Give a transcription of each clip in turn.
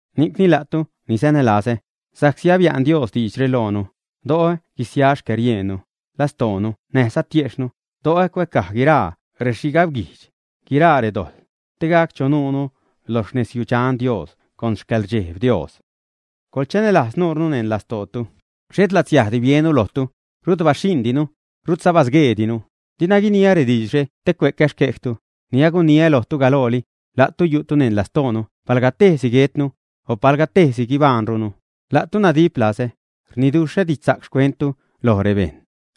Ni'cni, la'tu ni sanälazä, sa'csi abia'n Dios diidxre loonu, do'o guisia xcäriejnnu, lastoonu näjza tiejxhnu, do'o cuäcaj guiraa rexhigabguijdx, guiraa redojḻ, te gac sanu lo rexnezyudxan Dios con xcäḻrdxejb Dios. ¡Coḻchanälajz nuunu neṉ lastootu! Xhet latsiajdi biennu lojtu. Rut baxhiṉdinu. Rutza basgueedinu. Dina guiniä rediidxre te cue'cä xquejtu; ni aguniä lojtu galooli, la'tu yu'tu neṉ lastoonu palga tejsi guetnu, o palga tejsi guibajṉrunu. La'tu nadip lazä, rniduxhä didxsa'c xcuenttu lo bejṉ,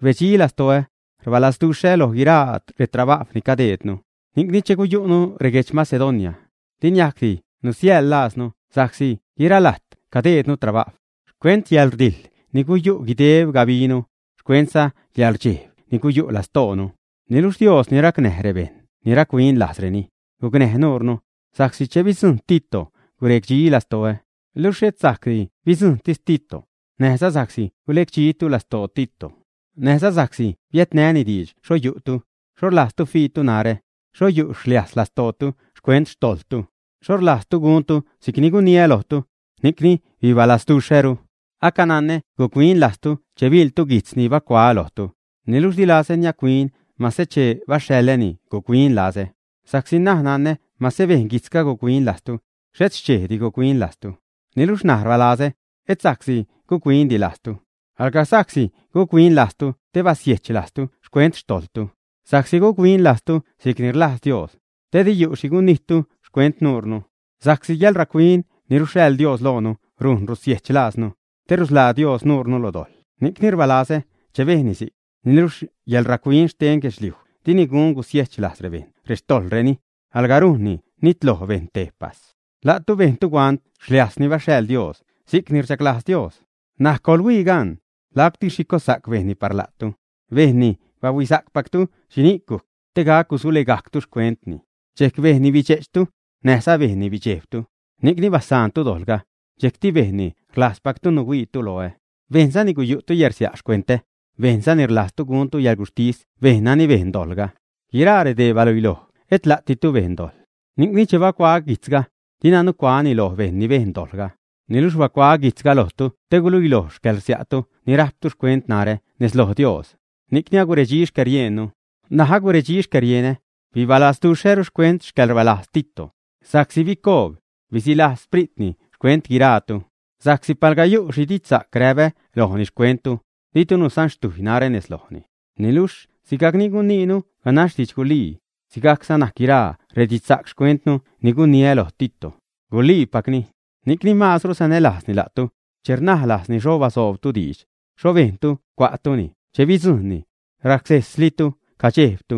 rbedxi lastoä, rbalazduxhä loj guiraa retrabajw ni cadeednu. Ni'cni che guyu'nu reguedx Macedonia, di niajcdi nusilajznu sa'csi guiralajt cadejdnu trabajw, xcuent yäḻrdijḻ ni guyu' guideb gabinu, xcuentza yäḻrdxejb ni guyu' lastoonu. Niluxh Dios ni racnäj rebejṉ ni rac-huin lajzreni, gucnäj nuure, sa'csi che bidzujṉ Tito guredxi lastoä. Luxh xhet sa'csi bidzujṉtis Tito, näjza sa'csi gulecdxitu lastoo Tito, näjza sa'csi biädnäni diidx xho yu'tu, xho rlajztu fiitu narä, xho yu' xliajs lastootu xcuent xtojḻtu, xho rlazduxhtu guntu si'cni guniä lojtu, ni'cni bibalasduxhäru. Acananä guc-huin lajztu che biḻtu guijtz ni bacuaä lojtu, niluxh di lazä niac-huin mase che baxhaḻäni guc-huin lazä, sa'csi ṉaj nanä mase bejn guijtzga guc-huin lajztu, xhet xchejdi guc-huin lajztu. Niluxh ṉaj rbalazä, et sa'csi guc-huindi lajztu, alga sa'csi guc-huin lajztu te basiejch lajztu xcuent xtojḻtu, sa'csi guc-huin lajztu si'cni rlajz Dios, te di yu' xhi gunijttu xcuent nuunu. Sa'csi yäḻrac-huin ni ruxhaḻ Dios loonu rujn rusiejch lajznu, te rusḻaa Dios nuurnu lo dojḻ ni'cni rbaalazä che bejnni si'c. Niluxh yäḻrac-huin xten guedxliuj dini gun gusiejch lajz rebejṉ rextojḻreni, alga rujnni nitloj bejṉ tejpas. La'tu bejntu huant xliajs ni baxhaḻ Dios si'cni rchaglajz Dios gac. N̲aj ¡coḻhuii gaṉ! ¡Lacti xhi cossa'c bejnni par la'tu! Bejnni bahuisa'cpactu xhini'c gujc, te gac gusulegajctu xcuentni; dxejc bejnni bidxe'chtu, näjza bejnni bidxejbtu, ni'cni basaantu dojḻga, dxejcti bejnni rlajzpactu nuhuiitu loä, bejnzani guyu'tu yärsia' xcuentä, bejnzani rlajztu guntu yäḻguxhtis bejṉ nani bejn dojḻga. Guiraa redee baluiloj et la'ditu bejn dojḻ. Ni'cni, che bacuaä guijtzga, dina nucuaäni loj bejṉ ni bejn dojḻga, niluxh bacuaä guijtzga lojtu te guiluiloj xcäḻrsia'tu ni rajptu xcuent narä nez loj Dios. Ni'cni aguredxi xcäriejnnu. N̲aj aguredxi xcärienä, bibalazduxhäru xcuent xcäḻrbalajz Tito, sa'csi bicoob, bisilajz xpritni xcuent guiraatu. Sa'csi palga yu' xhi didxsa'c ni räpä lojni xcuenttu, ditu nusanxtujy narä nez lojni. Niluxh sigajcni guniinu ganax didxgulii, sigajcza najc guiraa redidxsa'c xcuenttu ni guniä loj Tito, guliipacni. Ni'cni maazru sanälajzni la'tu, che rnaj lajzni xho basoobtu diidx, xho bejntu cua'tuni che bidzujṉnu, racsejslitu cadxejbtu.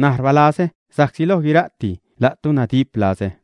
N̲aj rbaalazä sa'csi loj guira'ti la'tu nadip lazä.